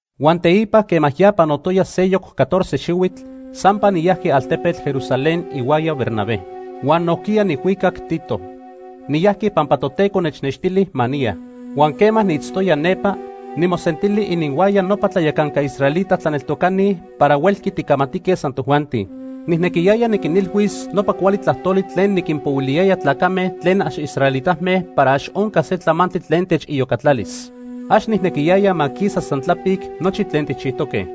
Huan teipa quema ya panotoya seyoc catorce xihuitl, sampa niyajqui altepetl Jerusalén ihuaya Bernabé. Huan nojquiya nijhuicac Tito. Niyajqui pampa Toteco nechnextili ma niya. Huan quema niitztoya nepa, nimosentili ininhuaya nopa tlayacanca israelita tlaneltocani para huelqui ticamatique san tojuanti. Nijnequiyaya niquinilhuis nopa cuali tlajtoli tlen niquinpohuiliyaya tlacame tlen ax israelitame para ax onca se tlamantli tlen techiyocatlalis. Ax nijnequiyaya ma quisa san tlapic nochi tlen tijchijtoque.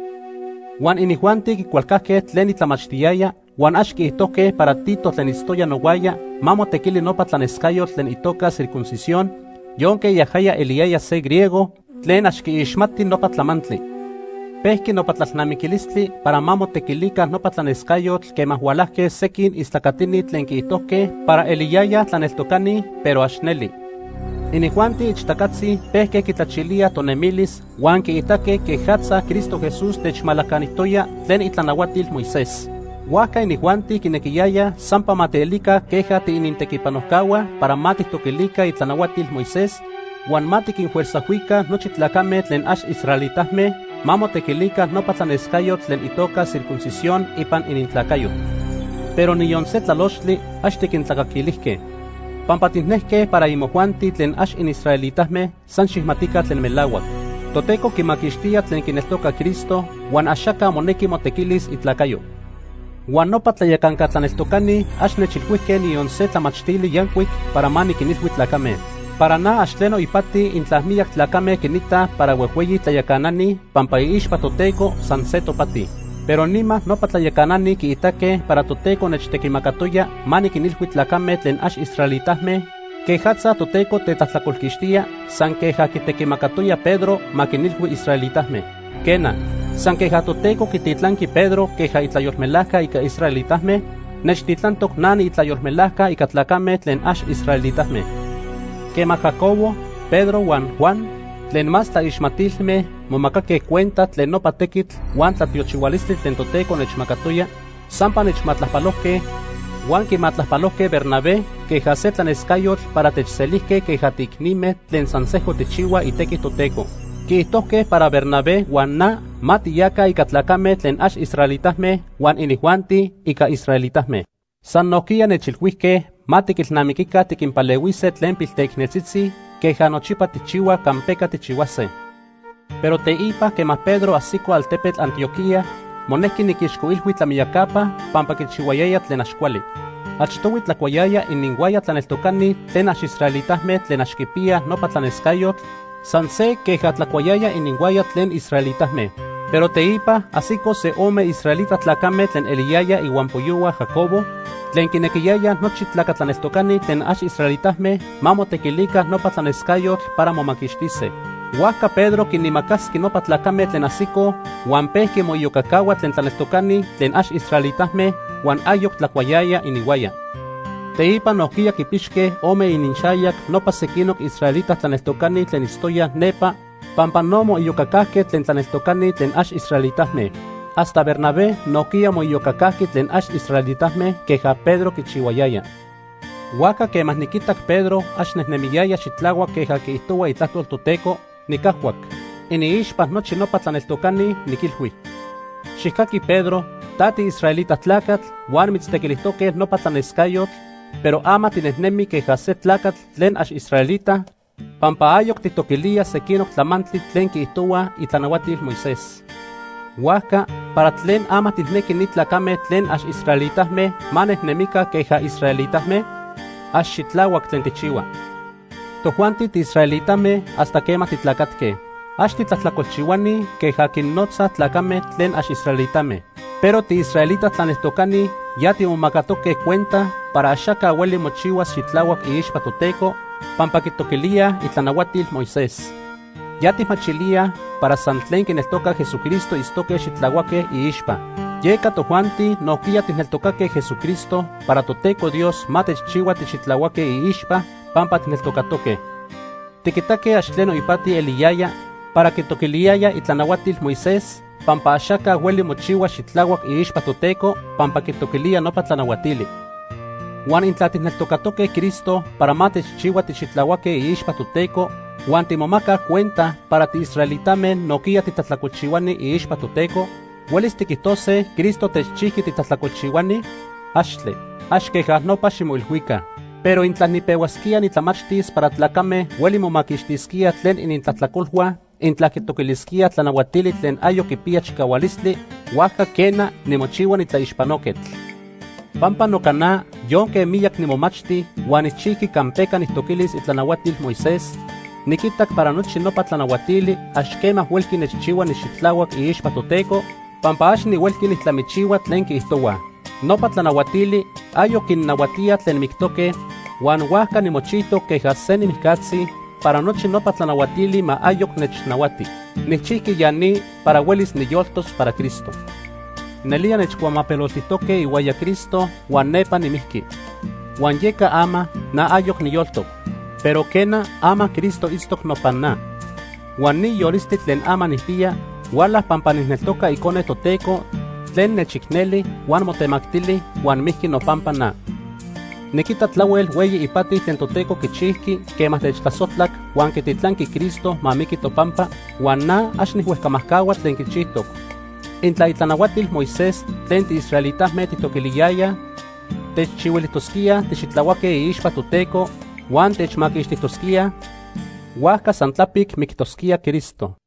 Huan inijuanti quicualcajque tlen nitlamachtiyaya, huan ax quiijtojque para Tito tlen itztoya nohuaya ma motequili nopa tlanescayotl tlen itoca circuncisión, yonque yajaya eliyaya se griego tlen ax quiixmati nopa tlamantli. Pejqui nopa tlalnamiquilistli para ma motequilica nopa tlanescayotl quema hualajque sequin istlacatini tlen quiijtojque para eliyayaj tlaneltocani, pero ax neli. Inijuanti ixtacatzi pejque quitlachilíaj tonemilis huan quiitaque quejatza Cristo Jesús techmalacanijtoya tlen itlanahuatil Moisés. Huajca inijuanti quinequiyayaj sampa ma tielica queja tiinintequipanojcahua para ma tijtoquilica itlanahuatil Moisés huan ma tiquinfuerzajhuica nochi tlacame tlen ax israelitame ma motequilica nopa tlanescayotl tlen itoca circuncisión ipan inintlacayo. Pero niyon se tlalochtli ax tiquintlacaquilijque. Pampa tijnejque para imojuanti tlen ax inisraelitame san xijmatica tlen melahuac: Toteco quimaquixtía tlen quineltoca Cristo, huan axaca monequi motequilis itlacayo. Huan nopa tlayacanca tlaneltocani ax nechilhuijque niyon se tlamachtili yancuic para ma niquinilhui tlacame. (Para na ax tleno ipati intla miyac tlacame quinitaj para huejhueyi tlayacanani, pampa iixpa Toteco san se topati.) Pero nima nopa tlayacanani quiitaque para Toteco nechtequimacatoya ma niquinilhui tlacame tlen ax israelitame quejatza Toteco tetlajtlacolquixtía, san queja quitequimacatoya Pedro ma quinilhui israelitame. Quena, san queja Toteco quititlanqui Pedro queja itlayolmelajca ica israelitame, nechtitlantoc na niitlayolmelajca ica tlacame tlen ax israelitame. Quema Jacobo, Pedro huan Juan tlen más tlaixmatilme momacaque cuenta tlen nopa tequitl huan tlatiochihualistli tlen Toteco nechmacatoya, sampa nechmatlajpalojque huan quimatlajpalojque Bernabé queja se tlanescayotl para techselijque queja tiicnime tlen san sejco tijchihuaj itequi Toteco. Quiijtojque para Bernabé huan na ma tiyaca ica tlacame tlen ax israelitame huan inijuanti ica israelitame. San nojquiya nechilhuijque ma tiquilnamiquica tiquinpalehuise tlen pilteicneltzitzi queja nochipa tijchihuaj campeca tijchihuase. Pero teipa, quema Pedro ajsico altepetl Antioquía, monejqui niquixcoilhui tlamiyacapa pampa quichihuayaya tlen ax cuali. Achtohui tlacuayaya ininhuaya tlaneltocani tlen ax israelitame tlen ax quipiyaj nopa tlanescayotl san se queja tlacuayaya ininhuaya tlen israelitame. Pero teipa, ajsicoj se ome israelita tlacame tlen eliyayaj ihuampoyohua Jacobo tlen quinequiyayaj nochi tlaca tlaneltocani tlen ax israelitame ma motequilica nopa tlanescayotl para momaquixtise. Huajca Pedro quinimacasqui nopa tlacame tlen ajsicoj huan pejqui moiyocacahua tlen tlaneltocani tlen ax israelitame, huan ayoc tlacuayaya ininhuaya. Teipa nojquiya quipixque ome ininxayac nopa sequinoc israelita tlaneltocani tlen itztoyaj nepa pampa no moiyocacajque tlen tlaneltocani tlen ax israelitame. Hasta Bernabé nojquiya moiyocacajqui tlen ax israelitame queja Pedro quichihuayaya. Huajca quema niquitac Pedro ax nejnemiyaya xitlahuac queja quiijtohua Itlajtol Toteco, nicajhuac. Iniixpa nochi nopa tlaneltocani, niquilhui: “Xijcaqui Pedro, ta tiisraelita tlacatl huan mitztequilijtoque nopa tlanescayotl, pero ama tinejnemi queja se tlacatl tlen ax israelita pampa ayoc tijtoquilía sequinoc tlamantli tlen quiijtohuaj itlanahuatil Moisés. Huajca, ¿para tlen ama tijnequi ni tlacame tlen ax israelitame ma nejnemica queja israelitame? Ax xitlahuac tlen tijchihua.” Tojuanti tiisraelitame hasta quema titlacatque. Ax “titlajtlacolchihuani” queja quinnotzaj tlacame tlen ax israelitame. Pero tiisraelita tlaneltocani ya timomacatoque cuenta para axaca hueli mochihuas xitlahuac iixpa Toteco pampa quitoquilíaj itlanahuatil Moisés. Ya tijmachilíaj para san tlen quineltoca Jesucristo itztose xitlahuaque iixpa. Yeca tojuanti nojquiya tijneltocaque Jesucristo para Toteco Dios ma techchihua tixitlahuaque iixpa pampa tijneltocatoque. Tiquitaque ax tleno ipati eliyaya para quitoquiliyaya itlanahuatil Moisés, pampa axaca hueli mochihua xitlahuac iixpa Toteco pampa quitoquilía nopa tlanahuatili. Huan intla tijneltocatoque Cristo para ma techchihua tixitlahuaque iixpa Toteco, huan timomacaj cuenta para tiisraelitame nojquiya titlajtlacolchihuani iixpa Toteco, ¿huelis tiquijtose Cristo techchijqui titlajtlacolchihuani? ¡Axtle! Ax queja nopa ximoilhuica. Pero intla nipehuasquía nitlamachtis para tlacame hueli momaquixtisquíaj tlen inintlajtlacolhua intla quitoquilisquíaj tlanahuatili tlen ayoc quipiya chicahualistli, huajca quena, nimochihua nitlaixpanoquetl. Pampa noca na, yonque miyac nimomachti huan nijchijqui campeca nijtoquilis itlanahuatil Moisés, niquitac para nochi nopa tlanahuatili ax quema huelqui nechchihua nixitlahuac iixpa Toteco, pampa ax nihuelqui nijtlamichihua tlen quiijtohuaj. Nopa tlanahuatili ayoc quinnahuatíaj tlen mictoque, huan huajca nimochijtoc queja se nimijcatzi para nochi nopa tlanahuatili ma ayoc nechnahuati. Nijchijqui ya ni para huelis niyoltos para Cristo. Nelía nechcuamapeloltijque ihuaya Cristo huan nepa nimijqui. Huan yeca ama na ayoc niyoltoc, pero quena, ama Cristo itztoc nopan na. Huan ni yolistli tlen ama nijpiya huala pampa nijneltoca Icone Toteco tlen nechicneli huan motemactili huan mijqui nopampa na. Niquita tlahuel hueyi ipati tlen Toteco quichijqui quema techtlasojtlac huan quititlanqui Cristo ma miqui topampa, huan na ax nijhuejcamajcahua tlen quichijtoc. Intla itlanahuatil Moisés tlen tiisraelitame tijtoquiliyayaj techchihuilijtosquíaj tixitlahuaque iixpa Toteco huan techmaquixtijtosquíaj, huajca san tlapic mictosquía Cristo.